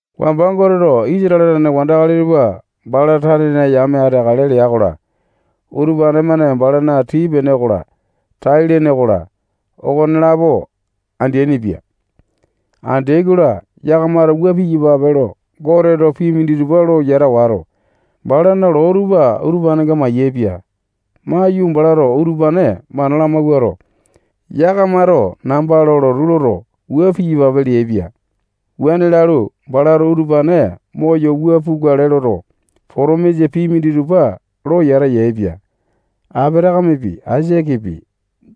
Wamba Goteto Isatale tane wandakali tupa bala tanena yame ateakale lea-kola, utupane-mane balana tii-pene okola, tai-lene okola, okonelapo andeaini-pia. Andeai-kola, yakamato wua piyapape lo Goteto pii minditupa lo yata wato, balana loo tupa utupanenga mayaepia. Maiyu, balato utupane mana lamawuato, yakamato namba lo lotu loto, wua piyapape leaipia. Wuane lalu, balato utupane moyo wua pukale loto, potomisa pii minditupa lo yata yaepia. Apatakamepi, Aisakepi,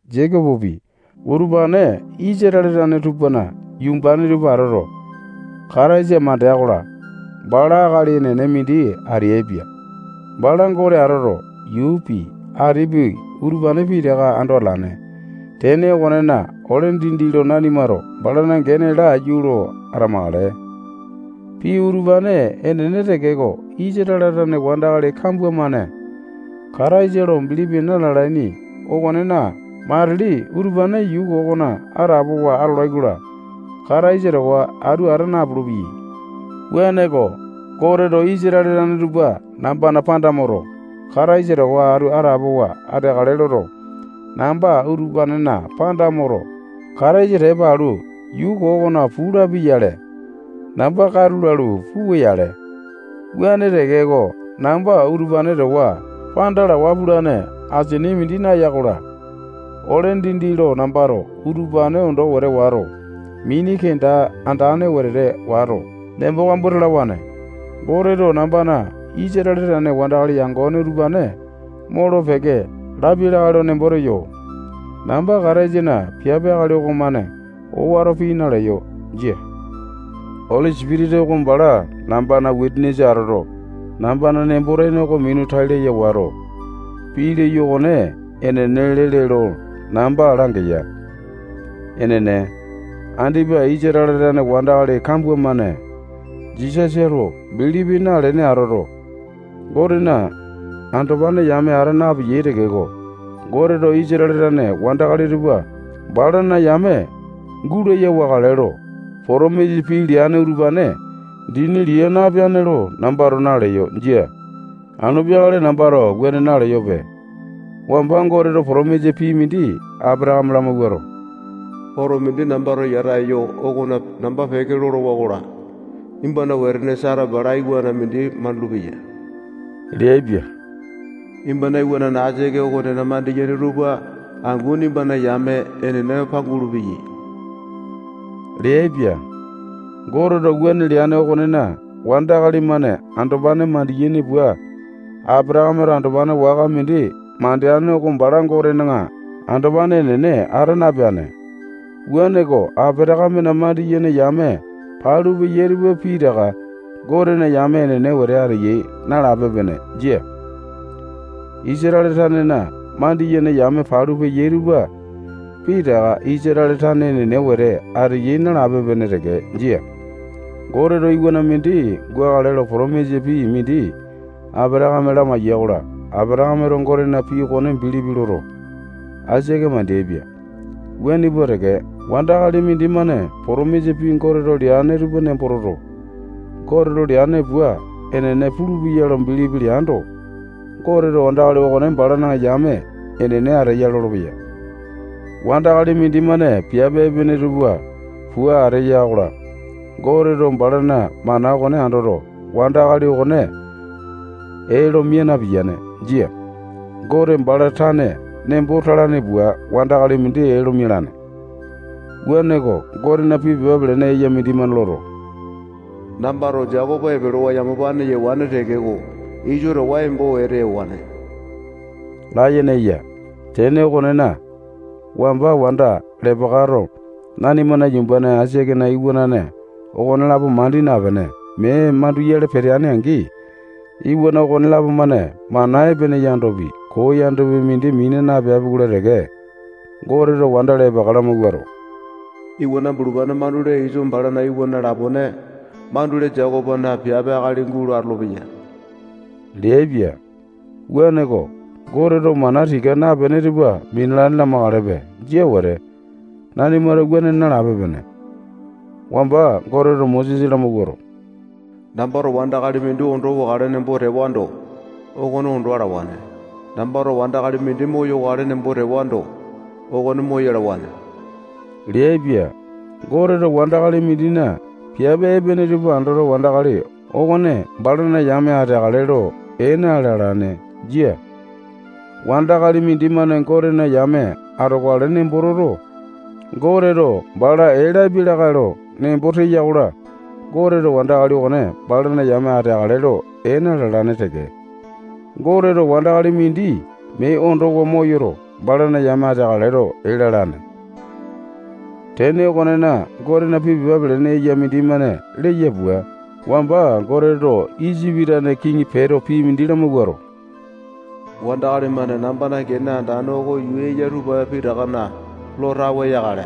Jekopopi, utupane Isatale tane tupana yumbane tupa atoto, Kataisa mandea-kola, bala akali enene mindi ateaipia. Bala Gote atoto, yuupi, atipi, utupane pitaka ando atalane. Tene okonena, ole dindi lo nanimato balana gene oko laiyu lo atamakale. Pii utupane enene tekeko, Isatale tane wandakali kambua-mane Kataisa lo bilipi na-lalaini okonena, matili utupane yuu koo okona atapowa atolai-kola, Kataisa towa atu ata napulu-peyai. Wuaneko, Goteto Isatale tane tupa nambana panda moto, Kataisa towa atu atapowa ateakale loto, namba utupanena panda moto, Kataisa tepa alu, yuu koo okona puu lapia-yale, namba katu lalu, puwa-yale. Wuane tekeko, namba utupane towa panda lawa pulane asini mindi naeya-kola, ole dindi lo nambato utupane ondo wete wato, mini kenda andane wetete wato, nembo kambua talawane. Goteto nambana Isatale tane wandakali yangone utupane molo-peke lapia lakae lo nembo teyo. Namba Kataisana piape akali okomane owato pii naleyo. Jia. Oli Sipitisa oko bala nambana wisanisa atoto, nambana nembo-tene oko minu tai laya wato, pii leyo okone enene lele lo namba langeya. Enene, andipa Isatale tane wandakali kambua-mane Jisasa lo bilipi nalene atoto, Gotena andopane yame ata napeyai tekeko, Goteto Isatale tane wandakali tupa balana yame gulaya wakale lo potomisa pii leane utupane dini lia napeane lo nambato naleyo. Jia. Anu peakale nambato wuane naleyope. Wamba Goteto potomisa pii mindi Apatakame lamawuato, oto mindi nambato yata eyo okona namba peke lolowa-kola, nimbana wetene Sata balato iwana mindi mandulu-peya leaipia. Nimbana iwanane Aisake okonena mandiyene tupa angu nimbana yame enene pangulu-peyai leaipia. Goteto wuane leane okonena, wandakali-mane andopane mandiyaini pua Apatakameto andopane waka mindi mandeane oko bala Gotena andopane enene ata napeane-ko. Apatakamena mandiyene yame palu peyai tupa pitaka Gotena yame enene wete ateyai nalape-pene. Jia. Isatale tanena mandiyene yame palu peyai tupa pitaka Isatale tane enene wete ateyai nalape-pene teke. Jia. Goteto iwana mindi gukale lo potomisa pii mindi Apatakame lamaiya-kola, Apatakameto Gotena pii okone bilipi loto, Aisake mandeaipia. Wuane pua teke, wandakali mindimane wandakali mindimane potomisa pii Goteto leane tupa nembo toto, Goteto leane pua enene pulupeya lo bilipi leando, Goteto wandakali okone balana yame enene ateya lolopeya. Wandakali mindimane piape epene tupa pua ateya-kola, Goteto balana mana okone andoto, wandakali okone ee lo mia napiyane. Jia. Gote bala tane nembo talane pua wandakali mindi ee lo mialane. Wuaneko, Gotena pii pepa pelene eya mindimane loto, nambato Jekopo epelewa yamapane yewane tekeko, Iso towa embo wete ewane layene eya. Tene okonena, wamba wanda Lepekato nanimana yumbane Aisakena iwanane okonelapo mandi napene, mee manduyale peteane-angi, iwana okonelapo-mane mana epene yandopi, koo yandopi, mindi mina napeapi-kola teke, Goteto wanda Lepeka lamawuato, iwana bulupane mandule Iso bala iwana lapone mandule Jekopona piape akali gulo atolopeya leaipia. Wuaneko, Goteto mana tika napene tupa minalane lamakalepe. Jia wete. Nanimato wuane nalape-pene. Wamba Goteto Mosesa lamawuato, nambato wandakali mindi ondo wakale nembo tewando, okone ondo alawane. Nambato wandakali mindi moyokale nembo tewando, okone moyalawane leaipia. Goteto wandakali mindina piape epene tupa andoto, wandakali okone balana yame ateakale lo ee na-lalane. Jia. Wandakali mindimane Gotena yame atokale nembo toto, Goteto bala lapia lakae lo nembo teya-kola, Goteto wandakali okone balana yame ateakale lo ee na-lalane teke. Goteto wandakali mindi mee ondowa moyoto, balana yame ateakale lo ee lalane. Tene okonena, Gotena pii pepa pelene eya mindimane leya pua, wamba Goteto Isipi tane kiŋi Peto pii mindi lamawuato, wandakali-mane nambana gene andane oko yuu eya tupa pitakana lo tawe yakale.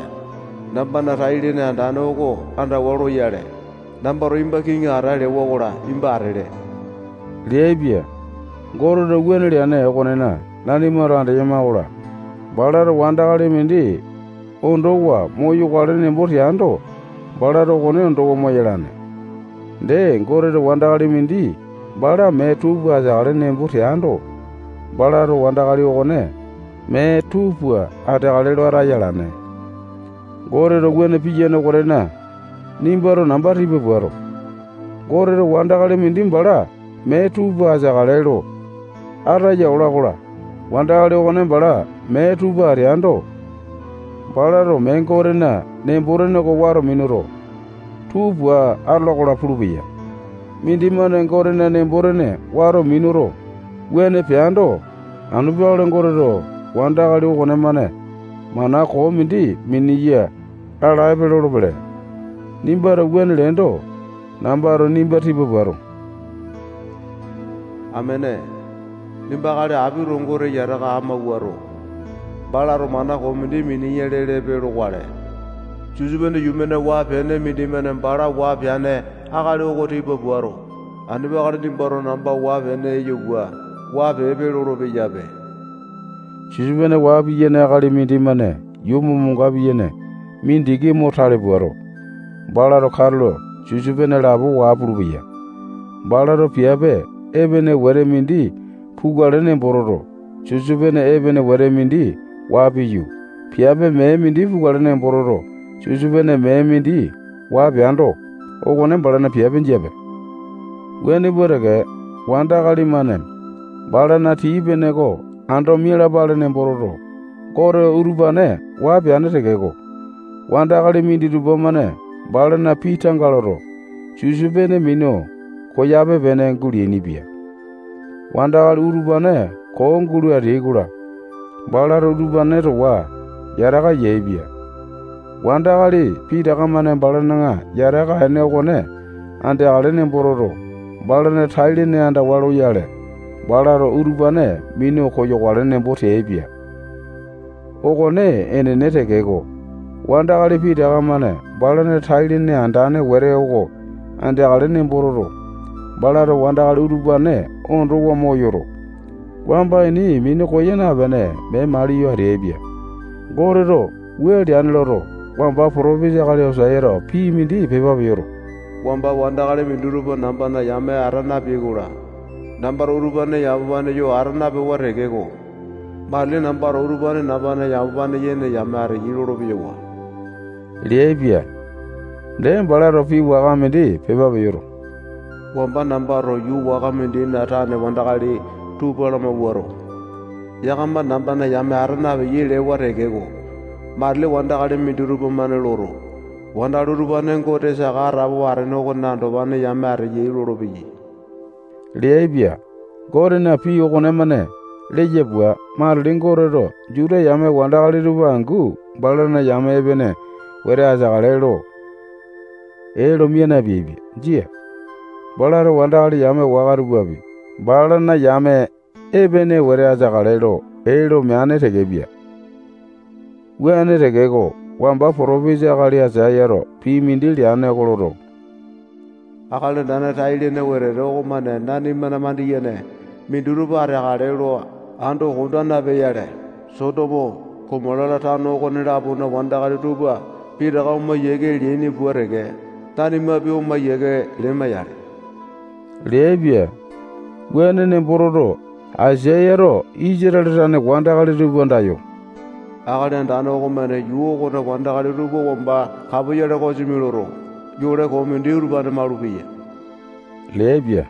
Nambana tai-lene andane oko andawa loyale, nambato nimba kiŋi ata lewa-kola, nimba atele leaipia. Goteto wuane leane okonena, nanimato andeyama-kola, balato wandakali mindi ondowa moyokale nembo teando, balato okone ondowa moyalane. Dee, Goteto wandakali mindi bala mee tuu pua ateakale nembo teando, balato wandakali okone mee tuu pua ateakale lo ataya alane. Goteto wuane piyane okonena, nimbato namba tipa puato, Goteto wandakali mindi bala mee tuu pua ateakale lo ataya ola-kola, wandakali okone bala mee tuu pua ateando, balato mee Gotena nembo-tene oko wato minuto, tuu pua atola-kola pulupeya. Mindimane Gotena nembo-tene wato minuto, wuane peando, anu peakale Goteto wandakali okonemane mana koo mindi miniya lalaepe lolopele. Nimbato wuane leendo, nambato nimba tipa puato, amene, nimba akali apito Gote yataka amauwato, balato mana koo mindi miniya lelepe lokale. Sisopene yuu-mane waa-pene mindimane bala waa peane akali oko tipa puato, anu peakale nimbato namba waa-pene eyo pua waa peepe lolo-peyape. Sisopene waa piyane akali mindimane yuu momonga piyene mindiki mo tale puato, balato katulo sisopene lapo waa pulupeya. Balato piape epene wete mindi pukale nembo toto, sisopene epene wete mindi waa piyu, piape mee mindi pukale nembo toto, sisopene mee mindi waa peando, okone balana piape jiape. Wuane pua teke, wandakali-mane balana tii-pene oko ando mialapale nembo toto, Goteto utupane waa peane tekeko, wandakali minditupa-mane balana pii tanga loto, sisopene minu koyape-pene guleainipia. Wandakali utupane koo gulo ateai-kola, balato utupane towa yataka yaepia. Wandakali pitaka-mane balana yataka ene okone andeakale nembo toto, balana tai-lene andawa loyale, balato utupane minu koyawakale nembo teaipia. Okone enene tekeko, wandakali pitaka-mane balana tai-lene andane wete oko andeakale nembo toto, balato wandakali utupane ondowa moyoto, wamba ini minu koya napene, mee maliyo ateaipia. Goteto wua leane loto, wamba potopisa akali Oseato pii mindi pepa peyoto, wamba wandakali minditupa nambana yame ata napeai-kola, nambato utupane yamapane yo ata napewa tekeko, matili nambato utupane nambana yamapane yene yame ateyai lolo-peyawa leaipia. Dee, balato pii waka mindi pepa peyoto, wamba nambato yuu waka mindina tane wandakali tupa lamawuato, yakama nambana yame ata napeyai lewa tekeko, matili wandakali minditupa-mane loto, wandakali utupane Gote saka atapowa atene okona andopane yame ateyai lolopeyai leaipia. Gotena pii okonemane leya pua, matili Goteto Juta yame wandakali tupa angu balana yame epene wete ateakale lo ee lo mia napeaipia. Jia. Balato wandakali yame waka tupapi balana yame epene wete ateakale lo ee lo meane tekepia. Wuane tekeko, wamba potopisa akali Aisayato pii mindi leane oko loto, Akali Andane tai-lene wetete okomane nanimana mandiyene minditupa ateakale lo ando konda napea-yale, Sotomo, Gomota-la, tano okone-lapona wandakali tupa pitaka oma yiake leaini pua teke, nanimapi oma yiake lema-yale leaipia. Wuane nembo toto, Aisayato Isatale tane wandakali tupa andayo, Akali Andane okomane yuu okona wandakali tupa wamba kapoyale kosimi loto, yole koo mindi utupane malupeya leaipia.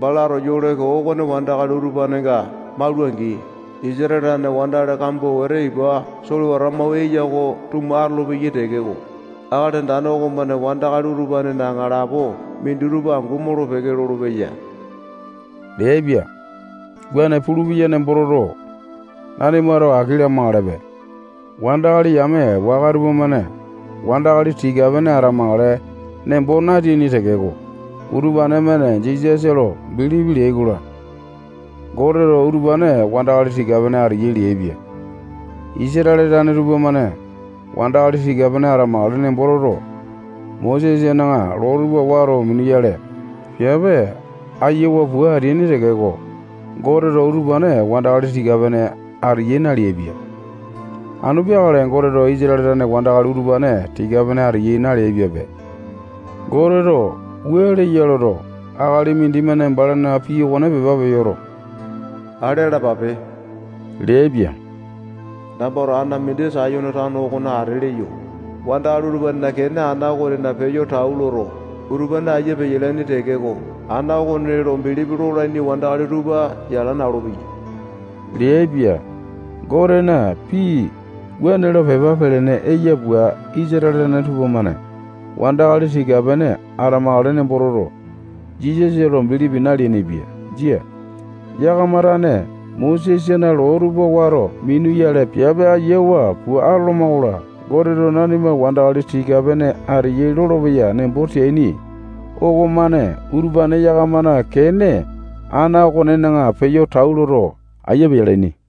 Balato yole koo okone wandakali utupanenga maula-angi, Isatale tane wandakali kambua wete ipa solewata mau eya oko tuma atolopeyai tekeko, Akali Andane okomane wandakali utupanena aŋalapo minditupa angu molo-peke lolopeya leaipia. Wuane pulupeya nembo toto, nanimato aki lamakalepe. Wandakali yame waka tupamane wandakali tika-pene atamakale nembo nateaini tekeko, utupane-mane Jisasa lo bilipi leai-kola, Goteto utupane wandakali tika-pene ateyai leaipia. Isatale tane tupamane wandakali tika-pene atamakale nembo toto, Mosesana loo tupa wato minuyale, piape ayiawa pua ateaini tekeko, Goteto utupane wandakali tika-pene ateyai naleaipia. Anu peakale Goteto Isatale tane wandakali utupane tika-pene ateyai na-leaipiape. Goteto wua leya loto, akali mindimane balana pii okone pepa peyoto, ale alapape leaipia. Nambato ana mindi Sayone tano okona ate leyo. Wandakali utupanena kene ana okonena peyo tau leya-kola, utupane aiya peyalaini tekeko, ana okone lo bilipi lolaini wandakali tupa yala na-olopeyai leaipia. Gotena pii wuane lo pepa pelene eya pua, Isatale tane tupamane wandakali tika-pene atamakale nembo toto, Jisasa lo bilipi naleainipia. Jia. Yakama tane Mosesana loo tupa wato minuyale, piape ayiawa pua atoloma-kola, Goteto nanima wandakali tika-pene ateyai lolopeya nembo teaini okomane utupane yakamana kene ana okonena peyo tau loto, aiya peyalaini.